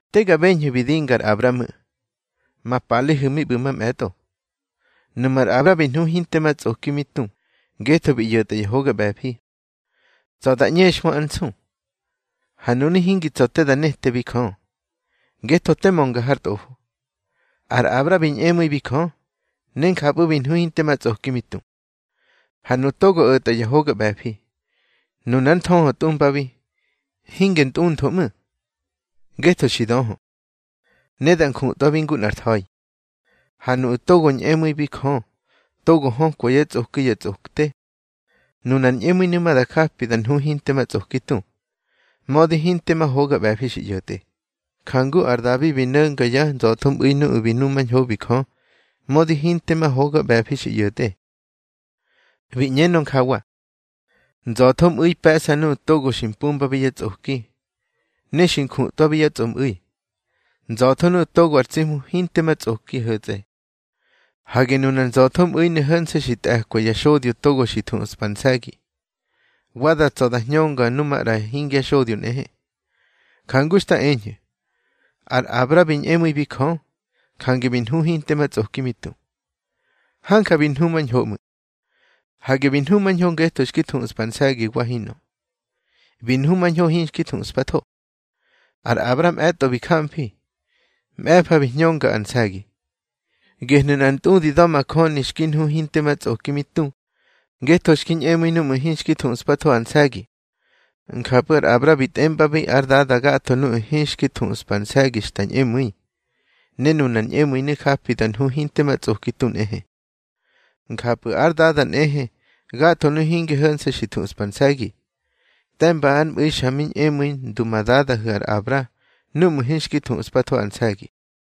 Te ga beñhu̱ bi dinga ar Abra ꞌmu̱, ma palehu̱ mi ꞌbu̱ mamꞌe̱tꞌo. Nuꞌmu̱ ar Abra bi nhu hinte ma tsꞌoki mi tu ngetho bi ꞌyo̱tꞌa ya hoga ꞌbe̱fi, tsa̱ da ꞌñexhmö ár nsu, ha nunu̱ hingi tsa̱ te da netebi Jö. Ngetho te mönga har Tꞌofo. Ar Abra bi ñꞌemu̱ibi Jö, ne njapꞌu̱ bi nhu hinte ma tsꞌoki mi tu. Ha nuꞌu̱ togo o̱tꞌa ya hoga ꞌbe̱fi, nunar nthöhö tꞌumbabi, hinge ntꞌuntho ꞌmu̱, ngetho xi döhö, ne da njutꞌwabi ngu nꞌar tha̱i. Ha nuꞌu̱ togo ñꞌemu̱ibi Jö togo hökwa yá tsꞌoki ya tsꞌokte, nunar ñꞌemu̱inu̱ ma da japi da nhu hinte ma tsꞌoki tu, mödi hinte ma hoga ꞌbe̱fi xi ꞌyo̱tꞌe. Jangu ar Dabi bi no̱nga yá nza̱thomꞌu̱i nuꞌu̱ bi numañhobi Jö, mödi hinte ma hoga ꞌbe̱fi xi ꞌyo̱tꞌe. Bi ꞌñenö njawa: Nza̱thomꞌu̱i pe̱ꞌsa nuꞌu̱ togo xi mpumbabi yá tsꞌoki, ne xi njutꞌwabi yá tsꞌomꞌu̱i. Nza̱tho nuꞌu̱ togo ar tsi Hmu hinte ma tsꞌoki ho̱tsꞌe. Hage nunar nza̱thomꞌu̱inu̱ ho̱nse̱ xi tꞌe̱kwa ya xodyo togo xi thuꞌspa ar nse̱gi, wa da tsa̱ da hñönga nu maꞌra hingya xodyo nꞌehe. Jangu xta eñhu̱, ar Abra bi ñꞌemu̱ibi Jö, jange bi nhu hinte ma tsꞌoki mi tu. Hanja bi nhumañho ꞌmu̱. Hage bi nhumañho ngetho xki thuꞌspa ar nse̱gi wa hinꞌö. Bi nhumañho hinxki thuꞌspatho. Ar Abra mꞌe̱tꞌo bi gamfi, mꞌe̱fa bi hñönga ar nse̱gi. Gehnu̱ nꞌar ntꞌudi da̱majöni xki nhu hinte ma tsꞌoki mi tu ngetho xki ñꞌemu̱i núꞌmu̱ hinxki thuꞌspatho ar nse̱gi. Njapꞌu̱ ar Abra bi tꞌembabi ár dada gatho nuꞌu̱ hinxki thuꞌspa ar nse̱gi xta ñꞌemu̱i, ne nunar ñꞌemu̱inu̱ japi da nhu hinte ma tsꞌoki tu nꞌehe. Njapꞌu̱ ár dada nꞌehe gatho nuꞌu̱ hinge ho̱nse̱ xi thuꞌspa ar nse̱gi, te̱mba ár mꞌu̱i xa mi ñꞌemu̱i ndu ma dadahu̱ ar Abra núꞌmu̱ hinxki thuꞌspathobi ar nse̱gi.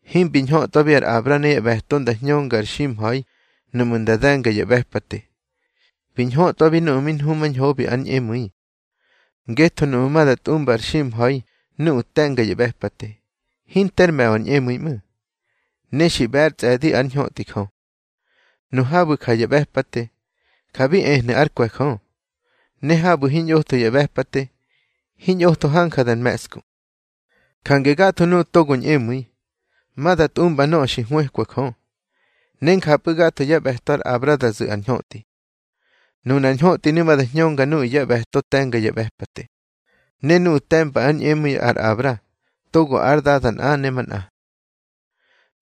Himbi ñhötꞌwabi ar Abra ne yá ꞌbe̱to nda hñönga ar ximha̱i nuꞌmu̱ nda de̱nga ya ꞌbe̱pate. Bi ñhötꞌwabi núꞌmu̱ mi nhumañhobi ár ñꞌemu̱i. Ngetho nuꞌmu̱ ma da tꞌumba ar ximha̱i nuꞌu̱ te̱nga ya ꞌbe̱pate, hinter me̱ꞌö ar ñꞌemu̱i ꞌmu̱, ne xi ꞌbe̱ ár tsꞌe̱di ár ñhötꞌi Jö. Nu habu̱ ja ya ꞌbe̱pate, ja bi ehnu̱ ár kwe̱ Jö. Ne habu̱ hiñꞌotho ya ꞌbe̱pate, hiñꞌotho hanja da me̱ꞌsku. Jange gatho nuꞌu̱ togo ñꞌemu̱i, ma da tꞌumba nöꞌö xi hwëkwa Jö, ne njapꞌu̱ gatho yá ꞌbe̱to ar Abra da zu̱ ar ñhötꞌi. Nunar ñhötꞌinu̱ ma da hñönga nuꞌu̱ yá ꞌbe̱to te̱nga ya ꞌbe̱pate, ne nuꞌu̱ te̱mba ár ñꞌemu̱i ar Abra togo ár dada nꞌa ne manꞌa.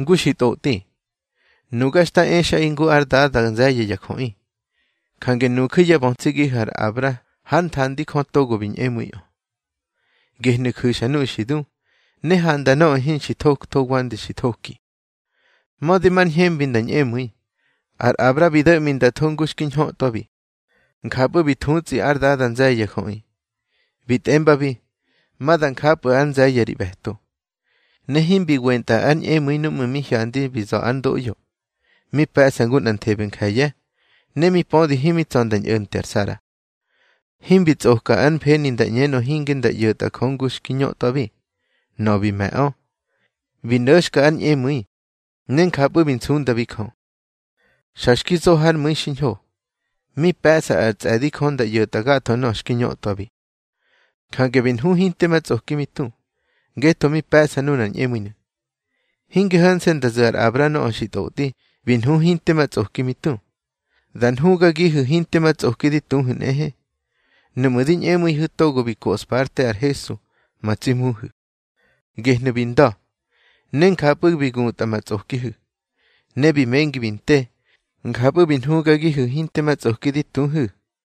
Ngu xi ntꞌotꞌi: Nuga xta exꞌaꞌi ngu ár dada nze̱ye̱ ya jöꞌi. Jange nuju̱ yá bötsigihu̱ ar Abra hár nthandi Jö togo bi ñꞌemu̱iꞌö. Gehnu̱ ju̱xa nuꞌu̱ xi du, ne handa nöꞌö hinxi thoktho wande xi thoki. Mödi mar ñhembi nda ñꞌemu̱i, ar Abra bi do̱ꞌmi nda tho ngu xki ñhötꞌwabi. Njapꞌu̱ bi thutsꞌi ár dada nze̱ye̱ ya jöꞌi. Bi tꞌembabi: Ma da njapꞌu̱ ár nze̱ye̱ ri ꞌbe̱to. Ne himbi wentꞌa ár ñꞌemu̱i núꞌmu̱ mi hyandi bi za̱ ár ndoꞌyo, mi pe̱ꞌsa ngu nꞌanthebe nje̱ye̱, ne mi pödi himi tsa̱ nda ñꞌo̱nte ar Sara. Himbi tsꞌoka ár mfeni nda ꞌñenö hinge nda ꞌyo̱tꞌa Jö ngu xki ñötꞌwabi. Nöꞌö bi me̱ꞌö, bi no̱xka ár ñꞌemu̱i, ne njapꞌu̱ bi nsundabi Jö. Xa xki zo hár mu̱i xiñho, mi pe̱ꞌsa ar tsꞌe̱di Jö nda ꞌyo̱tꞌa gatho nöꞌö xki ñötꞌwabi. Jange bi nhu hinte ma tsꞌoki mi tu, ngetho mi pe̱ꞌsa nunar ñꞌemu̱inu̱. Hinge ho̱nse̱ nda zu̱ ar Abra nöꞌö xi tꞌotꞌi bi nhu hinte ma tsꞌoki mi tu. Da nhugagihu̱ hinte ma tsꞌoki di tuhu̱ nꞌehe, núꞌmu̱ di ñꞌemu̱ihu̱ togo bi koꞌspa ár te ar Hesu ma tsi Hmuhu̱. Gehnu̱ bi nda̱, ne njapꞌu̱ bi gutꞌa ma tsꞌokihu̱. Ne bi mengi bi nte, njapꞌu̱ bi nhugagihu̱ hinte ma tsꞌoki di tuhu̱.